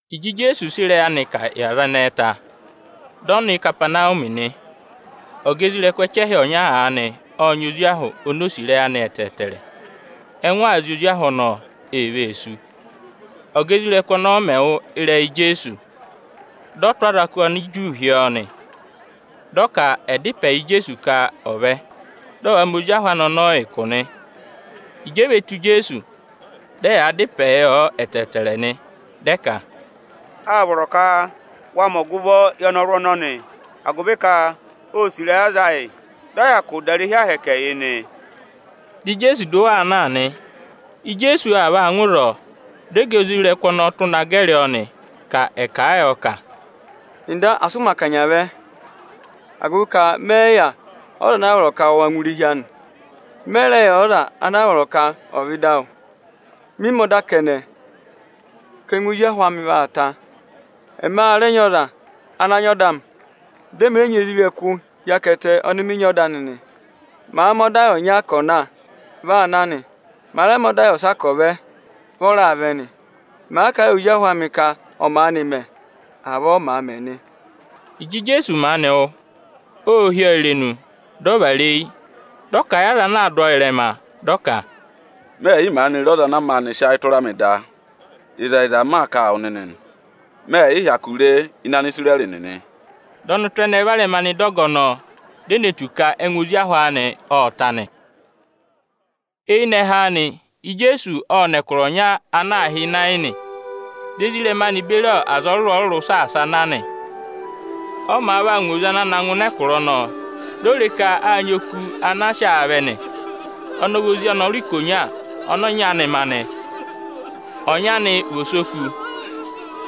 Ịjị Ijeesu sị ịrẹyị anị kà yị aza ẹnẹẹ ta, dị ọ nọ Ikapanawumi nị. Ọga isoja ẹchẹhị ọnya aanị ộ nyị ozi ahụ oni o sì ịrẹyị anị ẹtẹẹtẹrẹ. Ẹngụ aa zị ozi ahụ anị ọnọọ, ee vee sú. Ọ́ga isoja nịnị ọnọọ mẹ̀ wụ́ ịrẹyị Ijeesu, dị ọ tụ́ azọkụ Aniju hi ọọ nị. Dị ọ ka ẹ̀ dá ịpẹ yị Ijeesu ka ọ̀ vẹ, dị ọ̀ va mẹ ozi ahụ anị ọnọọ ụkụ nị. Ịjị e ve tù Ijeesu, dị ẹyaa dá ịpẹẹ yọ ẹtẹẹtẹrẹ nị, dị ẹ ka, “Â vọrọ ka wa mẹ ọgụvọ yị ọnọrụ ọnọnị, agụvị ka ô sì ịrẹyị aza ayị, dị ọ hyakụ dà irehi Ohomorihi yị nị.” Dị Ijeesu dụ wa aa na nị. Ijeesu aa vaa ngụ ịzọọ, dị ọga isoja nịnị ọnọọ tụ́ na gẹrị ọọ, ka ẹ̀ kà a yọ ka, “Nda, asị ụ mẹ̀ akanya vẹ, agụvị ka mẹ yị yà ọza ana a vọrọ ka wa ngụ irehi anị. Mẹ yị rẹ yà ọza ana a vọrọ ka ọ̀ vẹ ịdị awụ. Mị mẹ ọda kẹnẹ, ka ẹngụ ozi ahụ amị vaa ta. Ẹ ma rẹ nyị ọza ana nyị ọda amị, dị ẹmị rẹ nyị isoja nịnị hi akẹtẹ ọnị mị nyị ọda anị nị. Màa mẹ ọda yị ọnya ka ọ̀ na, vi aa na nị. Màa rẹ mẹ ọda yị ọsa ka ọ̀ vẹ, vị ọ raa vẹ nị. Màa ka ẹ yị ozi ahụ amị ka ọ̀ maanị mẹ, avọọ ọ màa mẹ nị.” Ịjị Ijeesu maanị wụ́, ô hí ọọ irenu, dị ọ vara eyi, dị ọ kà a yị aza ana aa dụ ọọ ịrẹma, dị ọ ka, “Mẹ ẹ̀ yị maanị re ọza ana maanị sị ayị tụra mị da; ịzẹyịza, m maa kà a wụ nịnị nị, mẹ yị hyakụ re ẹngụ ẹdọwụ ọnọnị ịdị Anisirẹrị nịnị.” Dị ọnụtụ ẹnẹẹ varẹma nọ ịdị ọga ọnọọ, di e ne tù ka ẹngụ ozi ahụ anị ộ ta nị. Eyinẹhẹ anị, Ijeesu ộ nọ ẹkụra ọnya ana aā hị́ Inayini; di ezirẹma anị beri aza ọrụrụ-ọrụrụ saasa a na nị. Ọ màa vaa ngụ oze ana na ngụ ịnị ẹkụra ọnọọ, di o re ka â nyị oku ana a sị aa vẹ nị. Oku ọnọọ ọ vị ozi ọnọrụ ikonya ọnị ọnyị anị ma nị. Ọnyị anị vị osoku.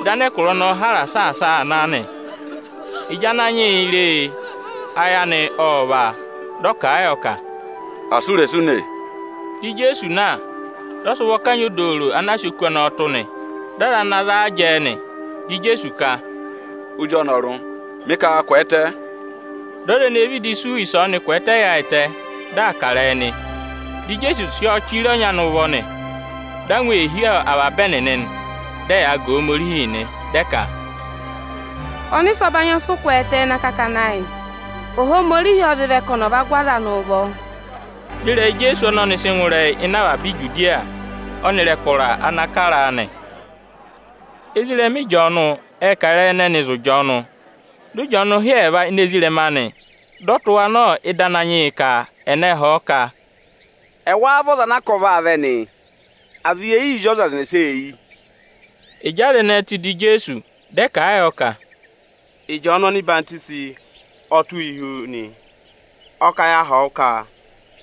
Dị anẹkụra ọnọọ hara saasa a aa na nị. Ịjị Ananyị yị re e, ayị anị ộ vá a. Dị ọ kà a yọ ka, “Asị u rè sụ ùnè!” Dị Ijeesu na, dị ọ sị ụvọ kanyị odooro ana a sị oku ọnọọ tụ́ nị. Dị aza ana za a jẹẹ nị. Dị Ijeesu ka, “Ozi ọnọrụ, mị ka wa kwẹẹtẹ!” Dị ọza ene vịdị sú ịsọọnị kwẹẹtẹ yaayịtẹ, dị aa kà ịrẹyị nị. Dị Ijeesu sị ọ chire ọnyị anị ụvọ nị. Angwa ô hí avaba ẹnịnị, dị ẹyaa ga Ohomorihi nị, dị ẹ ka, “Ọnịsẹ ọbanyị ọ sị kwẹẹtẹ ịnị akakana ayị o, Ohomorihi ọ zị vẹ ka ọnị ọ̀ va gụ aza anị ụvọ”. Dị ịrẹyị Ijeesu ọnọnị sị ngụ ịrẹyị ịnị avaba Ijudiya ọnịrị ẹkụra ana kara a nị. Ezirẹma Ịjọọnụ ệ kà ịrẹyị ẹnẹnị zụ̀ Ịjọọnụ. Dị Ịjọọnụ hị́ ẹẹva ini ezirẹma anị, dị ọ tụ́ wa nọ ịdị Ananyị yị ka ẹ̀ na họ̀ ọ ka, “Ẹwáá vị ọza ana a ka ọ vaa vẹ nị, à vị ye yii zí ọza ẹnẹsa eyi?” Ịjị aza ẹnẹẹ tù ịdị Ijeesu, dị ẹ kà a yọ ka, “Ịjọọnụ ọhwọzenyi ọ tụ́ yị hi wu nị. Ọ kà ya họ̀ wụ ka: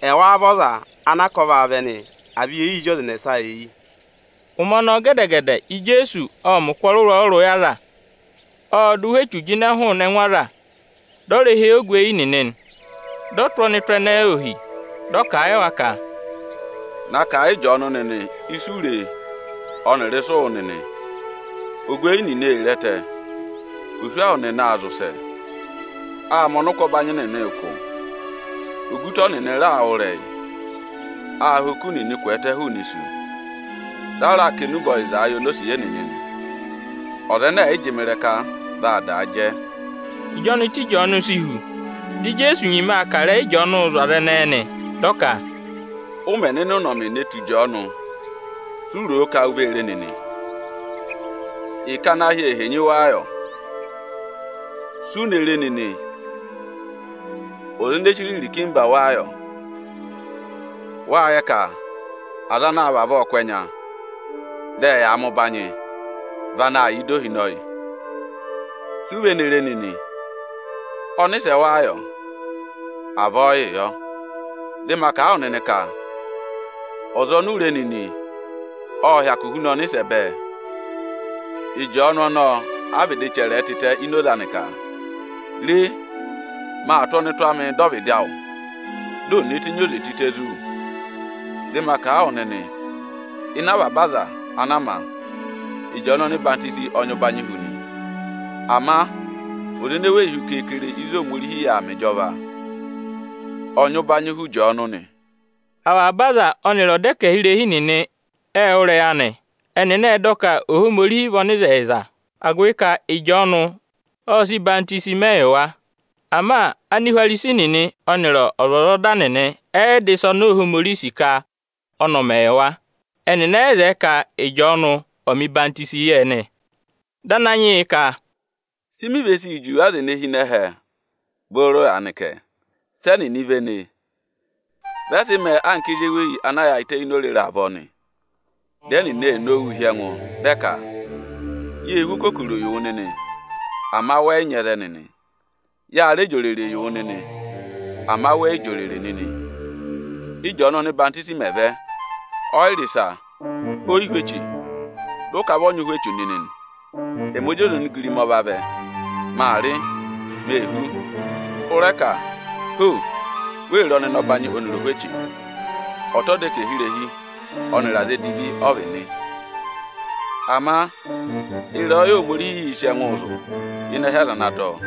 ‘Ẹwáá vị ọza ana a ka ọ vaa vẹ nị, à vị ye yii zí ọza ẹnẹsa eyi?’” Ụmẹ ọnọọ gẹdẹ-gẹdẹ, Ijeesu ộ mẹ̀ ụkụ ọrụrụ-ọrụrụ yị aza; ộ dụ ụhwẹ echu jịnẹ hụụnị ẹngụ aza, dị ọ rẹ há eyi ogweyi nịnị nị. Dị ọ tụ́ ọnụtụ ẹnẹẹ ohi, dị ọ kà a yị wa ka, “Na kà a yị Ịjọọnụ nịnị ịsị u re ọnịrị ịsị ụ wụ́ nịnị! Ogweyi nịnị ee re ẹtẹ, oswahụ nịnị aa zị ụsẹ, aa mẹ ọnịkwọbanyị nịnị ụkụ, ogutọ nịnị raa wụ́ ịrẹyị, aa ha oku nịnị kwẹẹtẹ hụụnị isu, dị a raa kà enube ọyịzaa yị onosiye nịnị nị. Ọza ẹnẹ ẹ̀ yị jị mị ịrẹka, vaa daa jẹ.” Ịjị ọnụtụ Ịjọọnụ si hu, di Ijeesu nyima aa kà ịrẹyị Ịjọọnụụ zụ̀ aza ẹnẹẹ nị. Dị ọ ka, “Ụ mẹ̀ nọ ịnị ụnọmị ne tù Ịjọọnụ, si u ro ka u vee re nịị? Ịkẹ ana ahị ee henyi wáá yọ? Si u ne re nịnị, ọza ene chire irikimba wáá yọ? Wâ yẹ ka aza anaā vavọọ kụ́ ẹnya, dị ẹyaa mẹ ụbanyị, vị anaā yà ịdị ohinọyị. Si u ve ne re nịnị? Ọnịsẹ wáá yọ? Avọọ yịị yọ; dị ma kà a wụ nịnị ka ọza oni u re nịnị ộ hyakụ huna ọnịsẹ bẹẹ. Ịjọọnụ ọnọọ a vịdị chẹrẹ ẹ tịtẹ ini oze anị ka: ‘Re! maa tụ́ ọnụtụ amịị dọ ọvịdị awụ, di ò ne tenyi oze tịtẹ zí wu.’ Dị ma kà a wụ nịnị, ịnị avaba aza ana a ma, Ịjọọnụ ọhwọzenyi ọ nyị ụbanyị hu nị. Ama ọza ene weyi hu ịzị Ohomorihi yà aa mẹ ịjọva, ọ nyị ụbanyị hu Ịjọọnụ nị. “Avaba aza ọnịrị ọdẹkẹhirehi nịnị ệ wụ́ ịrẹyị anị, ẹnịnị ệ dọ ka Ohomorihi vị ọnịzẹyịza, agụvị ka Ịjọọnụ ọ sị ọyịhwọzenyi mẹ yị wa. Ama Anihwarisi nịnị ọnịrị ọzwọzọda nịnị ẹ yị dọ ịsa oni Ohomorihi sì ka ọnị ọ̀ mẹ yị wa; ẹnịnị ẹ yị zẹẹ ka Ịjọọnụ ọ̀ mẹ̀ ọyịhwọzenyi yị ẹnị.” Dị Ananyị yị ka, “Si mi ve sii juwe aza ene hi ịnị ẹhẹ booro aanị kẹ? Sị ẹnịnị véné? Vị ẹ sị mẹẹ anka ezi eweyi ana yaayịtẹ ini orere avọọ nị. Dị ẹnịnị ee nowuu hị́ ẹngụ, dị ẹ ka: ‘Yê hú okokoro yị wụ nịnị, ama wẹ yị nyị ẹzẹ nịnị. Ya rẹ jị òrèrè yị wụ nịnị, ama wẹ yị jị òrèrè nịnị. Ị́jọọnụ ọhwọzenyi mẹ̀ vẹ, ọ yị rị ịsa, o yi hú eche, dị ụ ka vị ọ nyị ụhwẹ echu nịnị nị.’ Ẹ mị Ozi ọza onigirima ọ vavẹ, maa rị, mee hú, ụ rẹ ka ‘Ho! Wee re ọnịnọbanyị ọnịrị ohweche! Ọta ọdẹkẹhirehi ọnịrị aza edivi ọ vị nị.’ Ama ịrẹyọyẹ Ohomorihiī sị ẹngụụ zụ̀ ịnị ẹhẹ aza ana dọ ọ.”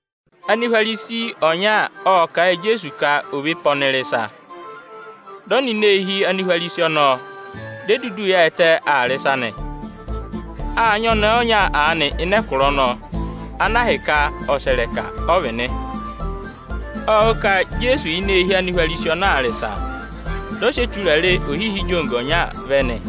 Anihwarisi ọnya ộ kà a yị Ijeesu ka ò ve pe ọnị rị ịsa. Dị ọ nọ ini eehi Anihwarisi ọnọọ, di e dudu yaayịtẹ aa rị ịsa nị. Â nyị ọnẹẹ ọnya aanị ịnị ẹkụra ọnọọ, ana ahịka ọsẹrẹka ọ vị nị. Ộ wụ́ ka Ijeesu yà ini eehi Anihwarisi ọnọọ aa rị ịsa. Dị ọ sị eturare ohihi ijogo ọnya vẹ nị.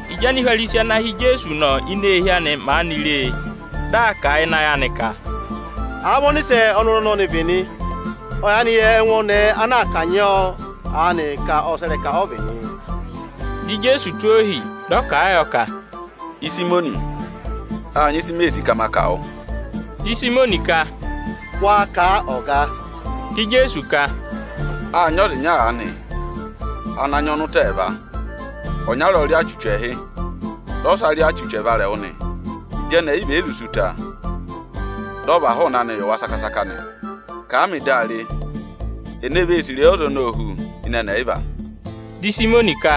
Ịjị Anihwarisi ana hị́ Ijeesu nọ ini eehi anị aanị maanị re e, dị aa kà a ịnị ayị anị ka, “Àa vị ọnịsẹ ọnọrụ ọnọnị vị nị, ọ yaanị yẹ ẹngụ ọnẹẹ ana aa kanyị ọọ aanị, ka ọsẹrẹka ọ vị nị.” Dị Ijeesu tụ́ ohi, dị ọ kà a yọ ka, “Ịsayịmọnị, â nyị ịsị mee sì ka ma kà wụ.” Di Ịsayịmọnị ka, “Wa kà a, ọga!” Di Ijeesu ka, “Â nyị ọza ịnya aanị ana nyị ọnụta ẹẹva. Ọnyara ọ rị ọọ achuchu ẹẹhị, dị ọsa rị ọọ achuchu ẹvarẹwụ nị. Ịjị ẹnị ẹyịva è yi zụ sí ụta, dị ọ và hụụnị anị yị wa saka-saka nị. Kà a mị di a re, ene vee sì ịrẹyị ọza ọnọọ hu ịnị ẹnị ẹyịva?” Dị Ịsayịmọnị ka,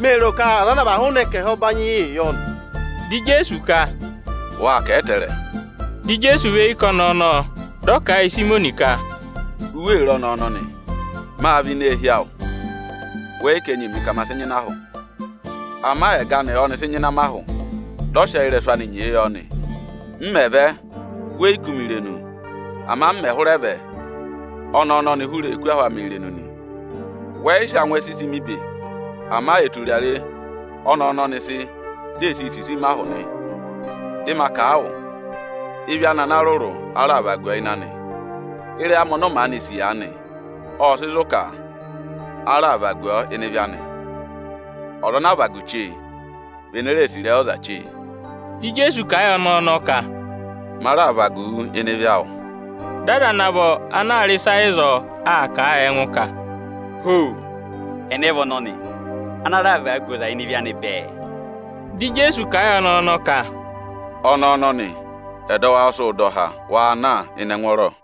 “Mee ro ka ọza ana a và hụụnị ẹkẹhị ọbanyị yị yọ nị.” Di Ijeesu ka, “Wâ kà a ẹtẹẹrẹ.” Di Ijeesu và eyi ká ọnẹẹ ọnọọ, dị ọ kà a yị Ịsayịmọnị ka, “U wee re ọnẹẹ ọnọnị? Mâ vẹ ini eehi awụ, wẹ yị ká enyi mị ka ma sị nyịna ahụ. Ama ẹgọ anị ọ́nị sị nyịna ahụ amị, dị ọ sị ẹyị ịrẹsụ anị nyee yọ nị. M mẹ̀ vẹ, we yi kú mi irenu; ama m mẹ̀ hụrẹ vẹ ọnẹẹ ọnọnị hụrẹ ee kú ahụ amị irenu nị. Wẹ yị rẹ sị angwẹ sisi mi ibe; ama eturare ọnẹẹ ọnọnị sị, di ee sii sisi mi ahụ nị. Dị ma kà a wụ, ịvị anị ana rụrụ a raà vagu ọ ịnị anị. Ịrẹyị amị ọnọọ maanị sì aanị, ọ́ sị zụ̀ ka a raà vagu ọọ ịnị ịvị anị. Ọza ana àa vagu chee, vị ene sì ịrẹyị ọza chee.” Dị Ijeesu kà a yị ọnẹẹ ọnọọ ka, “Ma raà vagu wu ịnị ịvị awụ.” Dị aza ana vọ ana aa rị ịsa ịzọọ, aa kà a yị ẹngụ ka, “Ho! Ẹnẹ vị ọnọnị, ana raa vagu ọza ịnị ịvị anị bẹẹ?” Dị Ijeesu kà a yị ọnẹẹ ọnọọ ka, “Ọnẹẹ ọnọnị, ẹdọwụ awụ ọ sị wụ dọ há; wa na ịnị ẹngwọọrọ!”